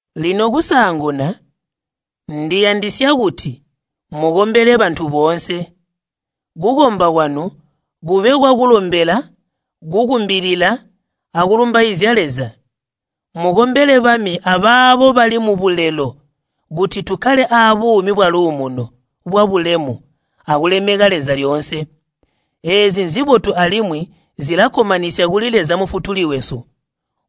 Lino kusaanguna ndiyandisya kuti mukombele bantu boonse. Kukomba kwanu kube kwakulombela, kukumbilila, akulumbaizya Leza. Mukombele bami abaabo bali mubulelo kuti tukkale aabuumi bwaluumuno, bwabulemu, akulemeka Leza lyoonse. Eezi nzibotu alimwi zilakkomanisya kuli Leza Mufutuli wesu,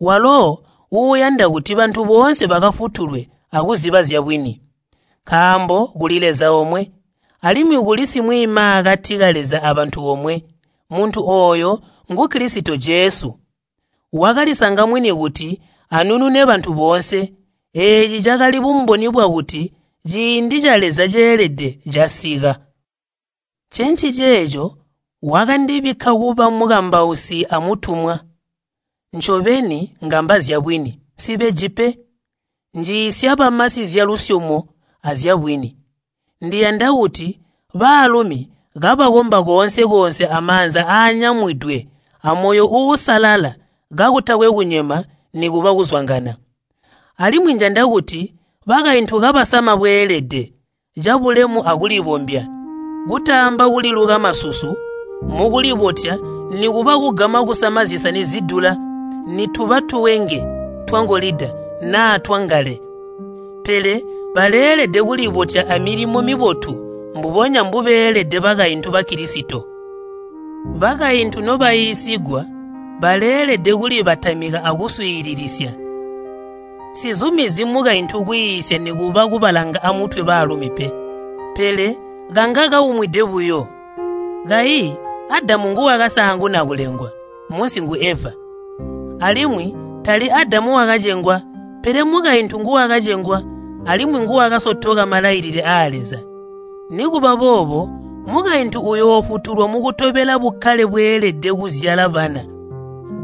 walo uuyanda kuti bantu boonse bakafutulwe akuziba zyabwini. Nkaambo kuli Leza omwe, alimwi kuli simwiimaakati ka Leza abantu omwe, muntu ooyo ngu Kilisito Jesu. Wakalisanga mwini kuti anunune bantu boonse. Eeci cakali bumboni bwakuti ciindi ca Leza ceelede casika. Ncenciceeco wakandibikka kuba mukambausi amutumwa. Ncobeni ngamba zyabwini, nsibeji pe. Njiisya bamasi zyalusyomo azyabwini. Ndiyanda kuti baalumi kabakomba koonse-koonse amaanza aanyamwidwe amoyo uusalala kakutakwe kunyema nikuba kuzwangana. Alimwi njanda kuti bakaintu kabasama bweelede, cabulemu akulibombya, kutaamba kuliluka masusu mukulibotya nikuba kugama kusama zisani zidula nituba tuwenge twangolida naa twangale. Pele baleelede kulibotya amilimo mibotu mbubonya mbubeelede bakaintu Bakilisito. Bakaintu nobaiisigwa baleelede kulibatamika akuswiilisisya. Nsizumizyi mukaintu kwiisya nikuba kubalanga amutwe baalumi pe, pele kanga kaumwide buyo. Kayi Adamu nguwakasaanguna kulengwa, munsi ngu Eva. Alimwi tali Adamu wakacengwa, pele mukaintu nguwakacengwa alimwi nguwakasotoka malailile aa Leza. Nikuba boobo mukaintu uyoofutulwa mukutobela bukkale bweelede kuzyala bana,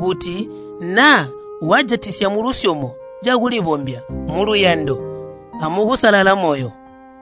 kuti naa wajatisya mulusyomo cakulibombya muluyando amukusalala moyo.